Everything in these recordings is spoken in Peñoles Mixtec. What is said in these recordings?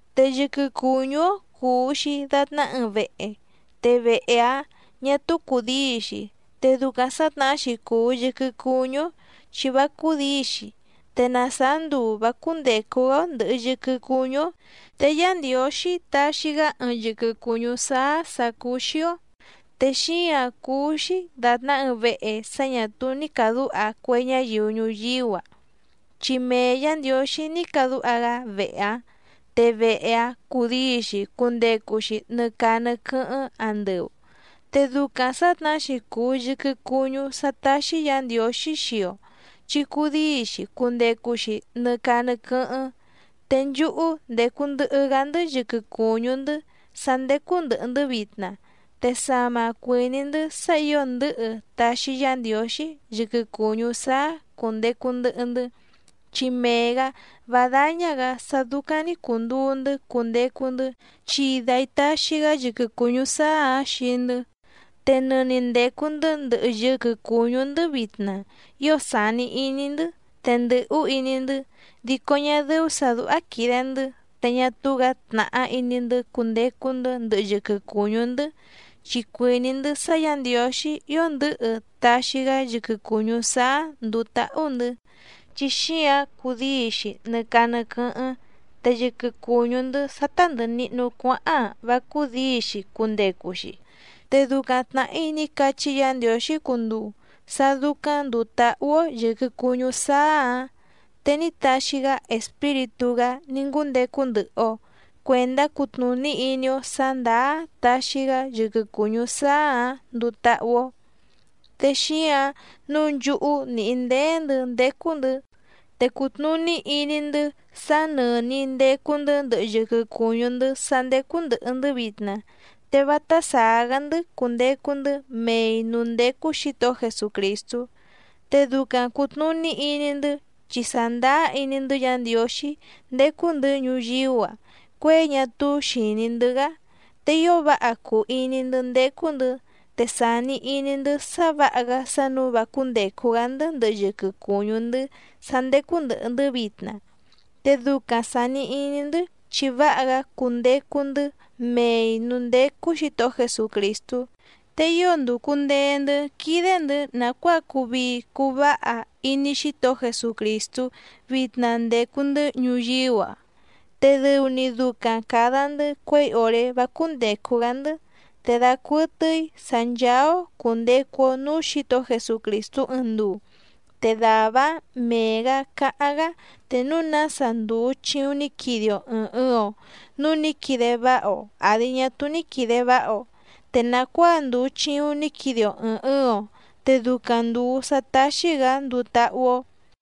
Te yɨquɨ cùñú‑ó cùu‑xi datná ɨɨⁿ vehe, te vehe‑áⁿ ñà túú cùdíi‑xi, te ducaⁿ sǎtnahá‑xi cùu yɨquɨ cuñú‑ó chi vá cúdǐi‑xi, te na sàá nduu vǎ cúndècu‑gá‑ó ndɨ̀hɨ yɨquɨ cuñú‑ó, te Yá Ndiǒxí taxi‑gá ɨɨⁿ yɨquɨ cùñú sáá sǎ cúú‑xí‑ó, te xíǎⁿ cúú‑xí dàtná ɨɨⁿ vehe sá ñà túú ní càdúha cue ñáyiu ñuyíú‑a, chi mee Yǎ Ndiǒxí ní cadúha‑gá vehe‑áⁿ te vehe‑áⁿ cudíi‑xi cundecu‑xi nɨ caa nɨ quɨ́hɨ́ⁿ andɨu. Te ducaⁿ sǎtnahá‑xi cùu yɨquɨ cuñú sá táxí Yǎ Ndiǒxí xii‑o chi cudíi‑xi cundecu‑xi nɨ caa nɨ quɨ́hɨ́ⁿ. Te nchúhú ndècu ndɨhɨ‑gá‑ndɨ́ yɨquɨ cùñú‑ndɨ́ sá ndécú ndɨ̀hɨ‑ndɨ́ vitna te sama cuìní‑ndɨ́ sá ǐo ndɨ̌hɨ taxi Yá Ndiǒxí yɨquɨ cùñú sáá cùndecu ndɨhɨ‑ndɨ́. Chi mee‑gǎ vá dáñá‑gǎ sá dúcáⁿ‑ní cùnduu‑ndɨ́ cundecu‑ndɨ́, chi dai taxi‑gá yɨquɨ cùñú sáá‑ǎⁿ xii‑ndɨ́. Te nɨni ndècu‑ndɨ́ ndɨhɨ yɨquɨ cùñú‑ndɨ́ vitna ío sàni iní‑ndɨ́ te ndɨ̀hú iní‑ndɨ́, dico ñá dɨ́ú sǎ dúhá quìde‑ndɨ́ te ñá túú‑gǎ tnàhá iní‑ndɨ́ cundecu‑ndɨ́ ndɨhɨ yɨquɨ cùñú‑ndɨ́, chi cuìní‑ndɨ́ sá Yǎ Ndiǒxí ío ndɨ̌hɨ taxi‑gá yɨquɨ cùñú sáá ndùu táhú‑ndɨ̌, chi xíǎⁿ cudíi‑xi nɨ caa nɨ quɨ́hɨ́ⁿ te yɨquɨ cùñú‑ndɨ́ sá tá ndɨ̀hɨ nihnu cuáháⁿ‑a vá cúdǐi‑xi cundecu‑xi. Te ducaⁿ tnàhí ní cachí Yǎ Ndiǒxí cunduu sá dúcáⁿ ndùu táhú‑ó yɨ̀quɨ cuñú sáá‑ǎⁿ, te ní taxi‑gá Espíritú‑gá ní ngúndecu ndɨhɨ‑o cuèndá cutnùní iní‑ó sǎ ndàá taxi‑gá yɨquɨ cùñú sáá‑ǎⁿ nduu táhú‑ó. Te xíǎⁿ nǔu nchúhú nìhí ndéé‑ndɨ̌ ndécú‑ndɨ̌, te cùtnuní iní‑ndɨ́ sá nɨ̀ni ndecu‑ndɨ́ ndɨhɨ yɨquɨ cùñú‑ndɨ́ sá ndécú ndɨ̀hɨ‑ndɨ́ vitna te vátá sàá‑gá‑ndɨ́ cundecu‑ndɨ́ mei nǔú ndécú Xǐtohó Jesucrìstú. Te ducaⁿ cùtnuní iní‑ndɨ́ chi sàndáá iní‑ndɨ́ Yǎ Ndiǒxí ndécú‑ndɨ̌ ñuyíú‑a cuěi ñá túú xìní‑ndɨ́‑gá. Te ío váha cùu iní‑ndɨ́ ndécú‑ndɨ̌, te sàni iní‑ndɨ́ sá vǎha‑gá sá nǔu vá cúndècu‑gá‑ndɨ́ ndɨhɨ yɨquɨ cùñú‑ndɨ́ sá ndécú ndɨ̀hɨ‑ndɨ́ vitna. Te ducaⁿ sàni iní‑ndɨ́ chi váha‑gá cundecu‑ndɨ́ mei nǔú ndécú Xǐtohó Jesucrìstú. Te ío ndùcu ndee‑ndɨ́ quídé‑ndɨ̌ nàcuáa cuu vii cuu váha iní Xítohó Jesucrìstú vitna ndècu‑ndɨ́ ñuyíú‑a, te dɨu‑ni ducaⁿ càda‑ndɨ́ cuěi òré vá cúndècu‑gá‑ndɨ́. Te dacuɨtɨ́í sǎ ncháá‑ó cùndecu‑o núú Xǐtohó Jesucrìstú ɨɨⁿ nduu, te dàvá‑áⁿ mee‑gǎ cáháⁿ‑gá te núu nása ndùu chiuⁿ ní quide‑o ɨ̀ɨⁿ ɨɨⁿ‑o, núu ní quide váha‑o àdi ñá túú ní quìde váha‑o, te nàcuáa ndùu chiuⁿ ní quide‑o ɨ̀ɨⁿ ɨɨⁿ‑o te ducaⁿ ndùu sá táxí‑gǎ nduu táhú‑ó.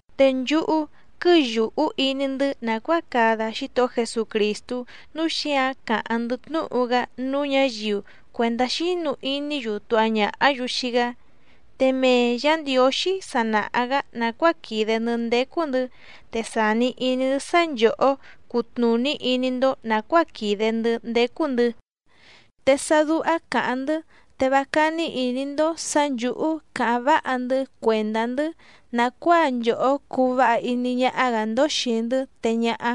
Te nchúhú quɨ́yùhú iní‑ndɨ́ nàcuáa cada Xítohó Jesucrìstú, núu xíǎⁿ càháⁿ‑ndɨ́ tnúhu‑gá núú ñǎyiu cuèndá xínu iní‑yu tuha ñàhá‑yu xii‑gá. Te mee Yǎ Ndiǒxí sa nàha‑gá nàcuáa quìde‑ndɨ́ ndécú‑ndɨ̌, te sàni iní‑ndɨ́ sá nchòhó cutnùní iní‑ndó nàcuáa quìde‑ndɨ́ ndécú‑ndɨ̌. Te sá dúhá càháⁿ‑ndɨ́ te vá cání ìní‑ndó sǎ nchǔhú càháⁿ váha‑ndɨ́ cuèndá‑ndɨ́ nàcuáa nchòhó cuu váha iní ñáhá‑gǎ‑ndó xìi‑ndɨ́ te ñáhá,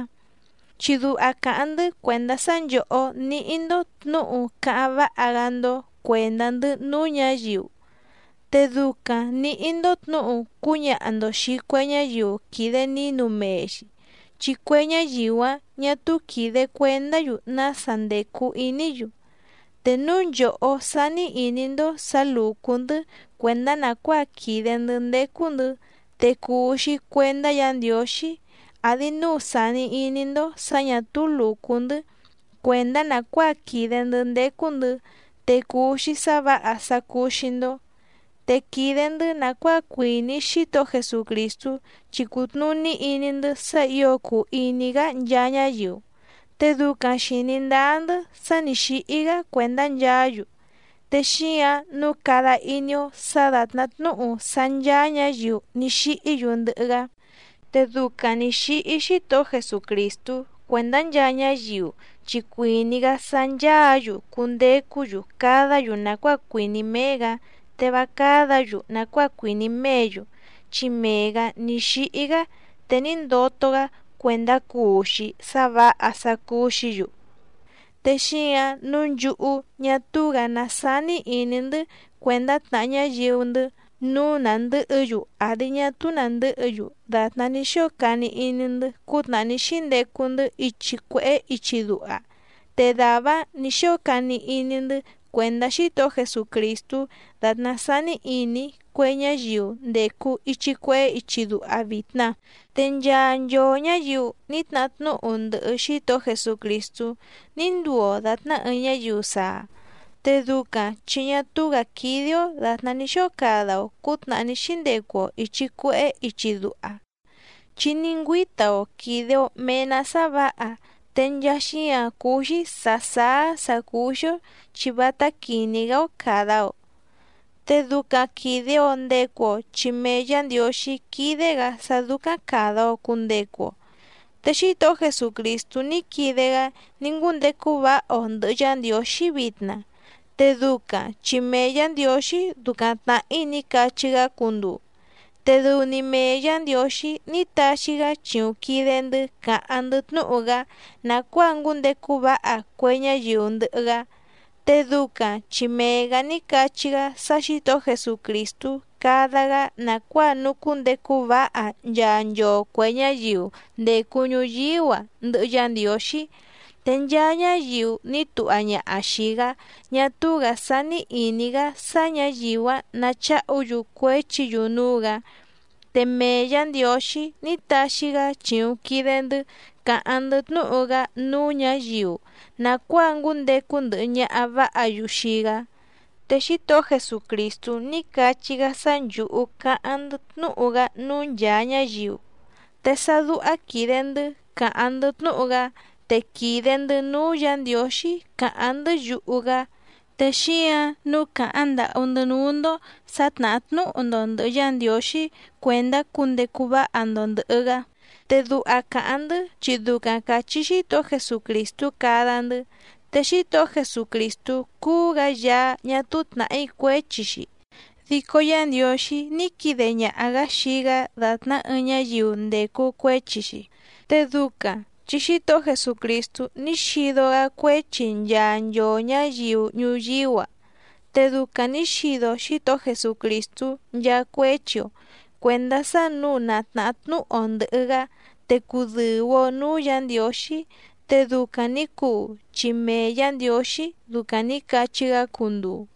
chi duha càháⁿ‑ndɨ́ cuèndá sá nchòhó níhí‑ndó tnǔhu cáháⁿ váha‑gá‑ndó cuèndá‑ndɨ́ núú ñǎyiu. Te ducaⁿ nǐhí‑ndó tnǔhu cúñaha‑ndo xìi cue ñáyiu quìde nínu mee‑xi, chi cue ñáyiu‑áⁿ ñà túú quìde cuendá‑yu nása ndècu iní‑yu. Te núu nchòhó sání ìní‑ndó sǎ lùcú‑ndɨ́ cuèndá nàcuáa quìde‑ndɨ́ ndécú‑ndɨ̌ te cùu‑xi cuendá Yǎ Ndiǒxí, àdi núu sàni iní‑ndó sǎ ñà túú lùcú‑ndɨ́ cuèndá nàcuáa quìde‑ndɨ́ ndécú‑ndɨ̌ te cùu‑xi sá vǎha sá cúú‑xí‑ndó. Te quìde‑ndɨ́ nàcuáa cuìní Xítohó Jesucrìstú chi cùtnuní iní‑ndɨ́ sá ǐo cùu iní‑gá nchaa ñáyiu, te ducaⁿ xìní ndáá‑ndɨ́ sá nǐ xíhí‑gá cuèndá nchaá‑yu, te xíǎⁿ nǔu cada iní‑ó sǎ dàtná tnúhu sá ncháá ñǎyiu ní xíhí‑yu ndɨhɨ‑gá. Te ducaⁿ nǐ xíhí Xítohó Jesucrìstú cuèndá nchaa ñáyiu chi cuìní‑gá sá nchàá‑yu cundecú‑yu cadá‑yu nàcuáa cuìní méé‑gǎ te vá cádǎ‑yu nàcuáa cuìní méě‑yu, chi mee‑gǎ ní xíhí‑gá te ní ndoto‑gá cuèndá cuu‑xi sá vǎha sá cúú‑xǐ‑yu. Te xíǎⁿ nǔu nchúhú ñá túú‑gǎ ná sání ìní‑ndɨ́ cuèndá tnàha ñáyiu‑ndɨ́ nǔu nàndɨ́hɨ‑yu àdi ñá túú nàndɨ́hɨ‑yu dàtná ní xóo cani iní‑ndɨ́ cútnàhá ní xíndecu‑ndɨ́ ichi cuèhé ichi duha, te dàvá‑áⁿ nǐ xóo cani iní‑ndɨ́ cuèndá Xítohó Jesucrìstú dàtná sání ìní cue ñáyiu ndècu ichi cuehé ichi duha vitna. Te nchaa nchoo ñǎyiu ní tnahá tnúhu ndɨhɨ Xítohó Jesucrìstú ní nduu‑o dàtná ɨɨⁿ ñáyiu saa, te ducaⁿ chi ñá túú‑gǎ quídé‑ó dàtná ní xóo cada‑o cǔtnàhá ní xíndecu‑o ìchi cuehé ichi duha, chi ní ngüíta‑o quìde‑o mee‑ná sá vǎha te nchaa xíǎⁿ cúú‑xí sǎ sáá sǎ cúú‑xí‑ó chi vátá quìní‑gá‑ó càda‑o. Te ducaⁿ quìde‑o ndecu‑o chi mee Yǎ Ndiǒxí quídé‑gǎ sá dúcáⁿ càda‑o cundecu‑o. Te Xítohó Jesucrìstú ní quide‑gá ní ngúndecu váha‑o ndɨ̀hɨ Yá Ndiǒxí vitna, te ducaⁿ chi mee Yǎ Ndiǒxí ducaⁿ tnàhí ní cachí‑gá cunduu, te dɨu‑ni mee Yǎ Ndiǒxí ní taxi‑gá chìuⁿ quide‑ndɨ́ càháⁿ‑ndɨ́ tnúhu‑gá nàcuáa ngúndecu váha cue ñáyiu ndɨhɨ‑gá. Te ducaⁿ chi mee‑gǎ ní cachí‑gá sá Xǐtohó Jesucrìstú cada‑gá nàcuáa nucúndecu váha nchaa nchoo cuè ñáyiu ndècu ñuyíú‑a ndɨhɨ Yá Ndiǒxí. Te nchaa ñáyiu ní tuha ñaha xìi‑gá ñá túú‑gǎ sání ìní‑gá sá ñǎyiu‑áⁿ nacháhu‑yu cuéchi‑yu núú‑gǎ. Te mee Yǎ Ndiǒxí ní taxi‑gá chìuⁿ quide‑ndɨ́ càháⁿ‑ndɨ́ tnúhu‑gá núú ñǎyiu nàcuáa ngúndecu ndɨhɨ ñaha vǎha‑yu xii‑gá. Te Xítohó Jesucrìstú ní cachí‑gá sá nchǔhú cáháⁿ‑ndɨ́ tnúhu‑gá núú nchàa ñáyiu, te sá dúhá quìde‑ndɨ́ càháⁿ‑ndɨ́ tnúhu‑gá te quìde‑ndɨ́ núú Yǎ Ndiǒxí càháⁿ‑ndɨ́ yuhu‑gá, te xíǎⁿ nǔu càháⁿ ndàhú‑ndɨ́ núú‑ndó sǎ tnàhá tnúhu‑ndo ndɨ̀hɨ Yá Ndiǒxí cuèndá cundecu váha‑ndo ndɨ̀hɨ‑gá, te duha càháⁿ‑ndɨ́ chi ducaⁿ càchí Xítohó Jesucrìstú cada‑ndɨ́. Te Xítohó Jesucrìstú cúú‑gǎ Yaá ñá túú tnàhí cuéchi‑xi, dico Yá Ndiǒxí ní quide ñaha‑gǎ xii‑gá dàtná ɨɨⁿ ñáyiu ndècu cuéchi‑xi, te ducaⁿ chi Xítohó Jesucrìstú ní xido‑gá cuéchi nchaa nchoo ñǎyiu ñuyíú‑a, te ducaⁿ nǐ xido Xítohó Jesucrìstú nchaa cuéchi‑o cuèndá sá nǔu na tnàhá tnúhu‑o ndɨ̀hɨ‑gá te cudɨ̀u‑o núú Yǎ Ndiǒxí, te ducaⁿ nǐ cuu chi mee Yǎ Ndiǒxí ducaⁿ nǐ cachí‑gá cunduu.